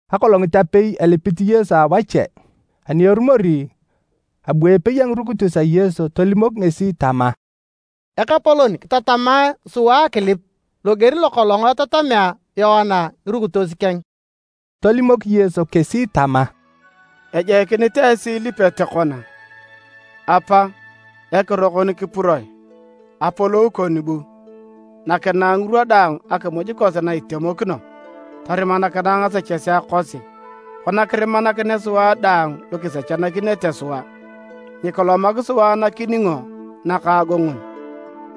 Akolongit apei elipit Yesu awache. Ani erumori, abu epei a ngirukitos a Yesu tolimok ngesi tama, “Ekapolon, kitatamae sua akilip loger lokolong etatamea Yoana ngirukitos keng.” Tolimok Yesu kesi tama, “Ejoikinit esi ilipete kona: ‘Apa: Ekiro kon kipuroe. Apolou kon bu. Nakinae ngirwa daang akimuj kosi na itemokino. Torimakinae ngasechesea kosi, kona kirimanakinea sua daang lu kisechanakinete sua. Nyikilomak sua nakiningo nakaagongon.’”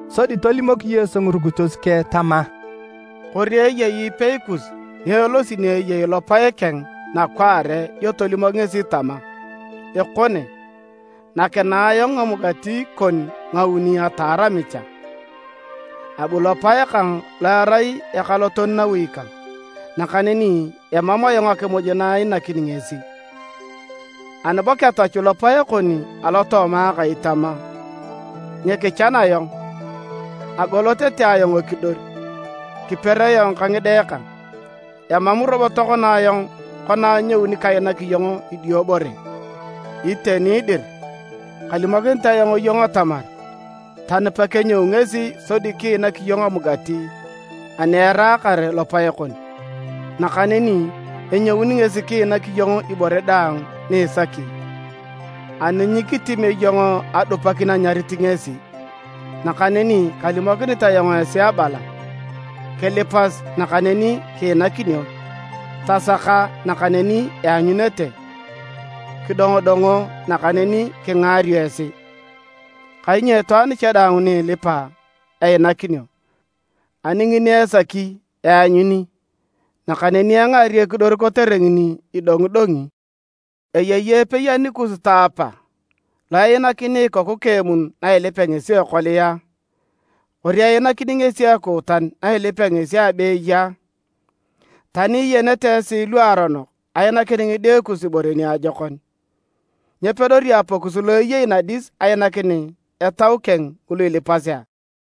Sodi tolimok Yesu ngirukitos keng tama, “Kori eyei ipei kus ni elosi ni eyei lopae keng nakwaare dio tolimok ngesi tama, ‘Ekone, nakinae ayong ngamugati kon ngauni ataar amicha. Abu lopae kang lo erai ekaloton nawi kang, nakaneni emam ayong akimuj na iinakini ngesi!’ Ani bo ketachu lopae kon alotooma akai tama, ‘Nyikichan ayong! Agol tete ayong ekidor, kiper ayong ka ngide kang, emam robo tokona ayong kona anyouni kainak iyong idiobore.’ Iteni dir, kalimokinit ayong iyong atamar tani pekenyou ngesi sodi kiinak iyong amugati ani eraakar lopae kon, nakaneni enyouni ngesi kiinak iyong ibore daang ni isaki, ani nyikitimio iyong adupakin anyarit ngesi. Nakaneni kalimokinit ayong esi abala: Kilipas nakaneni kiinakinio, tasaka nakaneni ianyunete, kidongodongo nakaneni kingaario esi. Kainyo itwaan daang ni ilipa einakinio, ani ngini esaki eanyuni, nakaneni engaario ekidor kotere ngini idongidongi. Eyei epei anikus taapa, lo einakini ikoku keng emun nailipea ngesi ekolia a? Kori einakini ngesi ekuutan na ilipea ngesi abeeye a? Tani iyenete esi luaronok ainakin ngide kus ibore niajokon, nyepedori Apakus lo eyei nadis ainakin Etau keng ngulu ilipasi a?”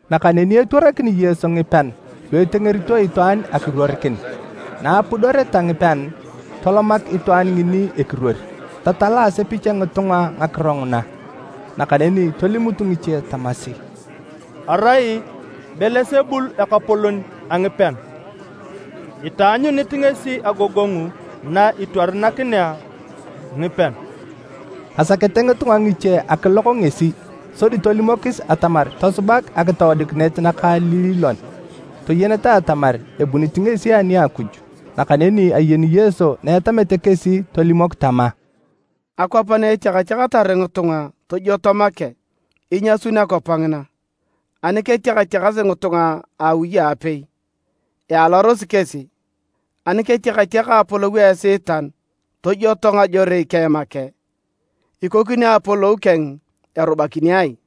Nakaneni etwarakini Yesu ngipean lu etengerito itwaan akiruorikin, na apudoreta ngipean, tolomak itwaan ngini ekiruor, tatala asepich a ngitunga ngakiro nguna, nakaneni tolimut ngiche tamasi, “Erai Belesebul ekapolon a ngipean itaanyunit ngesi agogongu na itwarakinea ngipean.” Asakete ngitunga ngiche akilok ngesi sodi tolimokis atamar tosubak akitoodikinet nakaililon toyeneta atamar ebunit ngesi ani a Akuj. Nakaneni ayeni Yesu na etamete kesi tolimok tama, “Akwap na etiakatiakatar ngitunga tojwoto make, inyasun akwap ngina, ani ketiakatiakasi ngitunga a awi aapei, ialarosi kesi. Ani ketiakatiaka Apolou a Esiitan tojwoto ngajorei keng make, ikokini Apolou keng erubakini ai?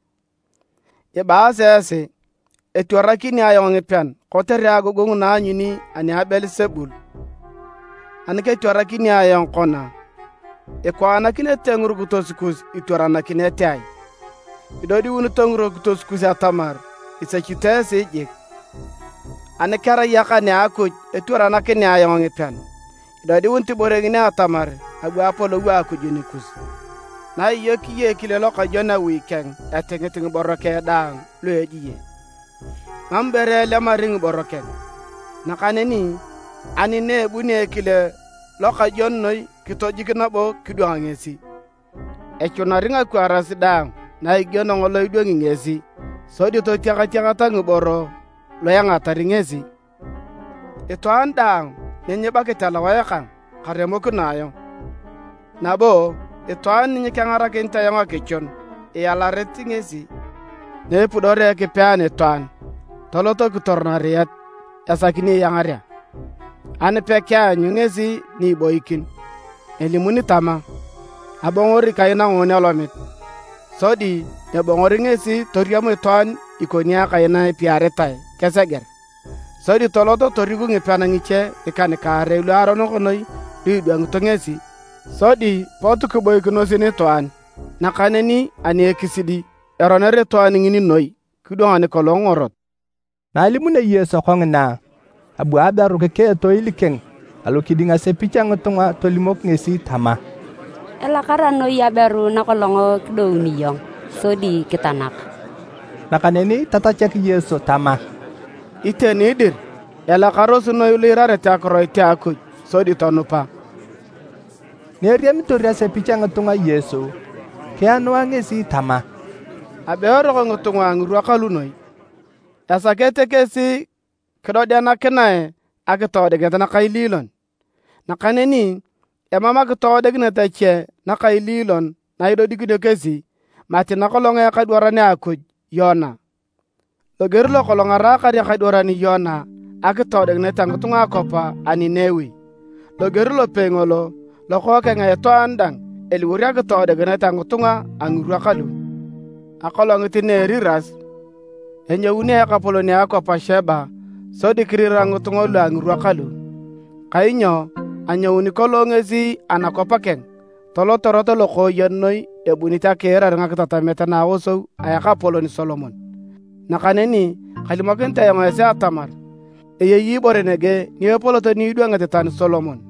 Ibaasi esi etwaranakini ayong ngipean kotere agogongu na aanyuni ani a Belesebul. Ani ketwaranakini ayong kona, ikwaanakinete ngirukitos kus itwaranakinete ai? Idodiunito ngirukitos kus atamar isechito esi jik! Ani kerai akan a Akuj etwaranakinea ayong ngipean, idodiunit ibore ngini atamar abu Apolou a Akuj nikus. “Naiyokio ekile lokajwon awi keng etingit ngiboro keng daang lu ejie, mam ibore elemari ngiboro keng. Nakaneni ani na ebunio ekile lokajwon noi kitijik nabo kidwang ngesi, echunari ngakwaaras daang na igieno ngolo idwangi ngesi, sodi totiakatiaka ngiboro lu engatari ngesi. “Itwaan daang ni nyibakit alowae kang, karemokino ayong, nabo itwaan ni nyekengarakinit ayong akichun, ialarit ngesi. “Naepudorea Ekipe anitwaan, tolot kitor nariet esaki ni iangarea. Ani pekeanyu ngesi ni iboikin, elimuni tama, ‘Abongori kai nangoon alomit!’ Sodi ebongori ngesi toriam itwaan ikoni akai na epiaritae keseger. Sodi tolot toriku ngipean ngiche ngikan-kaarei luaronok noi lu idwangito ngesi, sodi pot kiboikinos nitwaan. Nakaneni ani ekisidi, eroner itwaan ngini noi kidwang nikolong ngorot.” Na alimunio Yesu kongina, abu aberu kikea etoil keng alokiding asepich a ngitunga tolimok ngesi tama, “Elakara noi aberu nakolong kidouni iyong, sodi kitanak!” Nakaneni tatachak Yesu tama, “Iteni dir, elakarosi noi lu iirarete akiroit a Akuj sodi tonupa!” Na eriamitor asepich a ngitunga Yesu, kianua ngesi tama, “Abe eroko ngitunga a ngirwa kalu noi! Esakete kesi kidodikinae akitoodikinet nakaililon, nakaneni emam akitoodikinet ache nakaililon na idodikinio kesi mati nakolong a Ekadwaran a Akuj Yona. Loger lokolong araakar ekadwaran Yona akitoodikinet a ngitunga a akwap a Ninewi, loger lopei ngolo, Lokookeng a Itwaan dang eliwor akitoodikinet a ngitunga a ngirwa kalu. Akolongit na a eriras, enyouni akapolon a akwap a Cheba sodi kirira ngitunga lu a ngirwa kalu, kainyo anyouni kolong ngesi anakwap keng tolot erot lokooyen noi ebunit akiirar ngakitatamet na aosou a ekapolon Solomon, nakaneni kalimokinit ayong esi atamar eyei ibore nege ni epolot ni idwangit tani Solomon.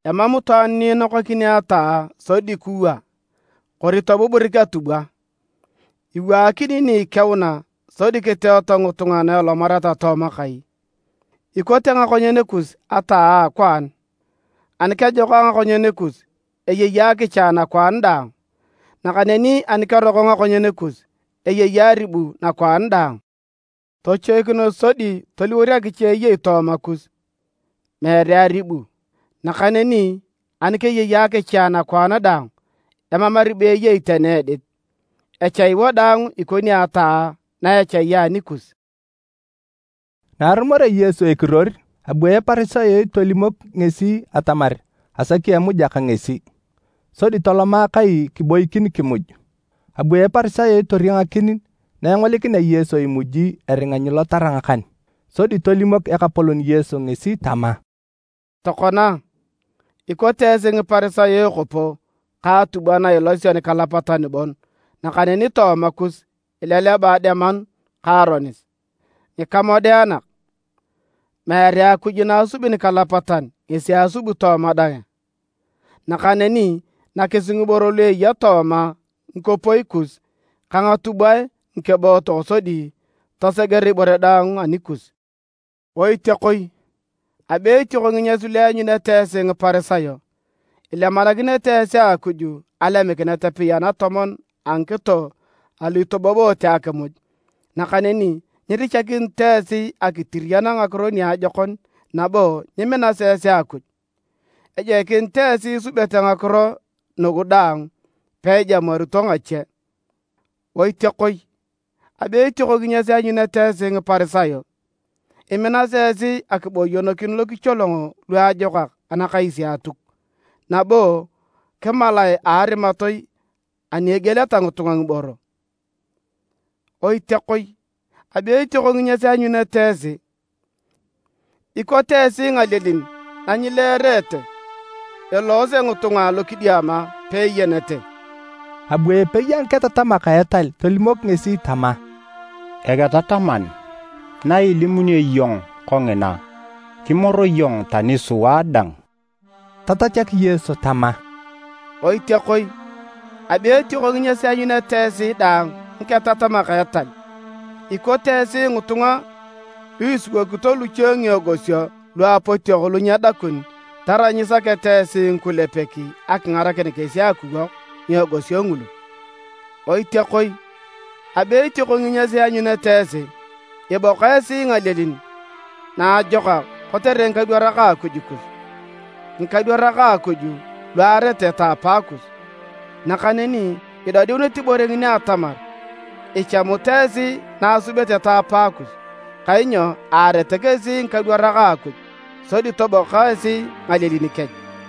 “Emam itwaan ni inokakini ataa sodi kiwaa, kori tobuburik atubwa, iwaakinio ni ikeuna sodi kiteeto ngitunga na elomareta tooma kai. Ikote ngakonyen kus ataa a akwaan, ani kejokak ngakonyen kus, eyei akicha nakwaan daang, nakaneni ani keroko ngakonyen kus, eyei aribu nakwaan daang. Tochoikinos sodi toliwor akicha eyei tooma kus, meere aribu. Nakaneni ani keyei akicha nakwaan daang, emam aribu eyei tani edit, echai wadaang ikoni ataa na echai anikus.” Na arumorea Yesu ekiruor, abu Eparisayot tolimok ngesi atamar asaki emuja ka ngesi, sodi toloma kai kiboikin kimuj. Abu Eparisayot toriangakin na engolikinea Yesu imuji eringa nyilotara ngakan. Sodi tolimok Ekapolon Yesu ngesi tama, “Tokona, ikote esi Ngiparisayo ekopo ka atubwa na ilasio nikalapatan bon nakaneni tooma kus ileleba ademanu ka aronis. Ngikamodeanak! Meere Akuj na asubi nikalapatan ngesi asubi tooma dang a? Nakaneni nakisi ngiboro lu eya tooma ngikopoi kus ka ngatubwae ngikebootok sodi toseger ibore daang anikus. “Oitiakoi! Abe etioko nginyas lu ianyunete esi Ngiparisayo! Ilemanakinete esi Akuj alemikinet apei anatomon a ngikito alu itoboboote akimuj, nakaneni nyirichakinito esi akitiriyan ngakiro niajokon nabo nyiminasi esi Akuj. Ejoikinit esi isubete ngakiro nugu daang peijamuarito ngache. “Oitiakoi! Abe etioko nginyas ianyunete esi Ngiparisayo. Iminasi esi akiboyonokin lokicholongo luajokak anakais a Atuk, nabo kimalae a arimatoi ani egieleta ngitunga ngiboro. Oitiakoi! Abe etioko nginyas ianyunete esi. Ikote esi ngalielin na nyileerete, eloose ngitunga alokidiama peeyenete.” Abu epei a ngiketatamak a etal tolimok ngesi tama, “Eketataman, na ilimunio iyong kongina, kimor iyong tani sua dang!” Tatachak Yesu tama, “Oitiakoi! Abe etioko nginyas ianyunete esi dang ngiketatamak a etal! Ikote esi ngitunga, lu isiwokito luche ngiegosio lu apotiok lu nyedakun tarai nyisakete esi ngikulepek akingarakin kesi akiwok ngiegosio ngulu. Oitiakoi! Abe etioko nginyas ianyunete esi! Iboka esi ngalielin naajokak kotere ngikadwarak a Akuj kus, ngikadwarak a Akuj lu aarete taapaakus. Nakaneni idodiunit ibore ngini atamar ichamut esi na asubete taapaakus, kainyo aarete kesi ngikadwarak a Akuj, sodi toboka esi ngalielin kech.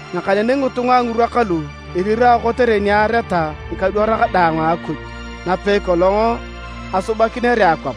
Nakaneni ngitunga a ngirwa kalu irirao kotere ni aareta ngikadwarak daang a Akuj napei kolong asubakinere akwap,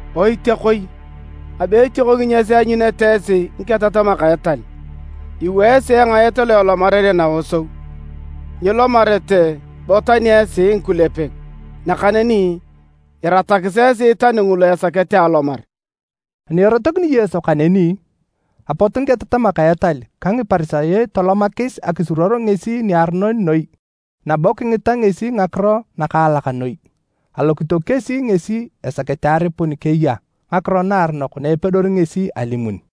“Oitiakoi! Abe etioko nginyas ianyunete esi ngiketatamak a etal. Iwaa esi engaet lo elomarere naosou. Nyilomarete bo tani esi ngikulepek, nakaneni iratakis esi tani ngulu esakete alomar!” Ani erotokini Yesu kaneni, apot ngiketatamak a etal ka Ngiparisayo tolomakis akisuruor ngesi niaronon noi nabo kingita ngesi ngakiro nakaalak noi. Alokito kesi ngesi esakete aripun keya ngakiro naaronok na epedori ngesi alimun.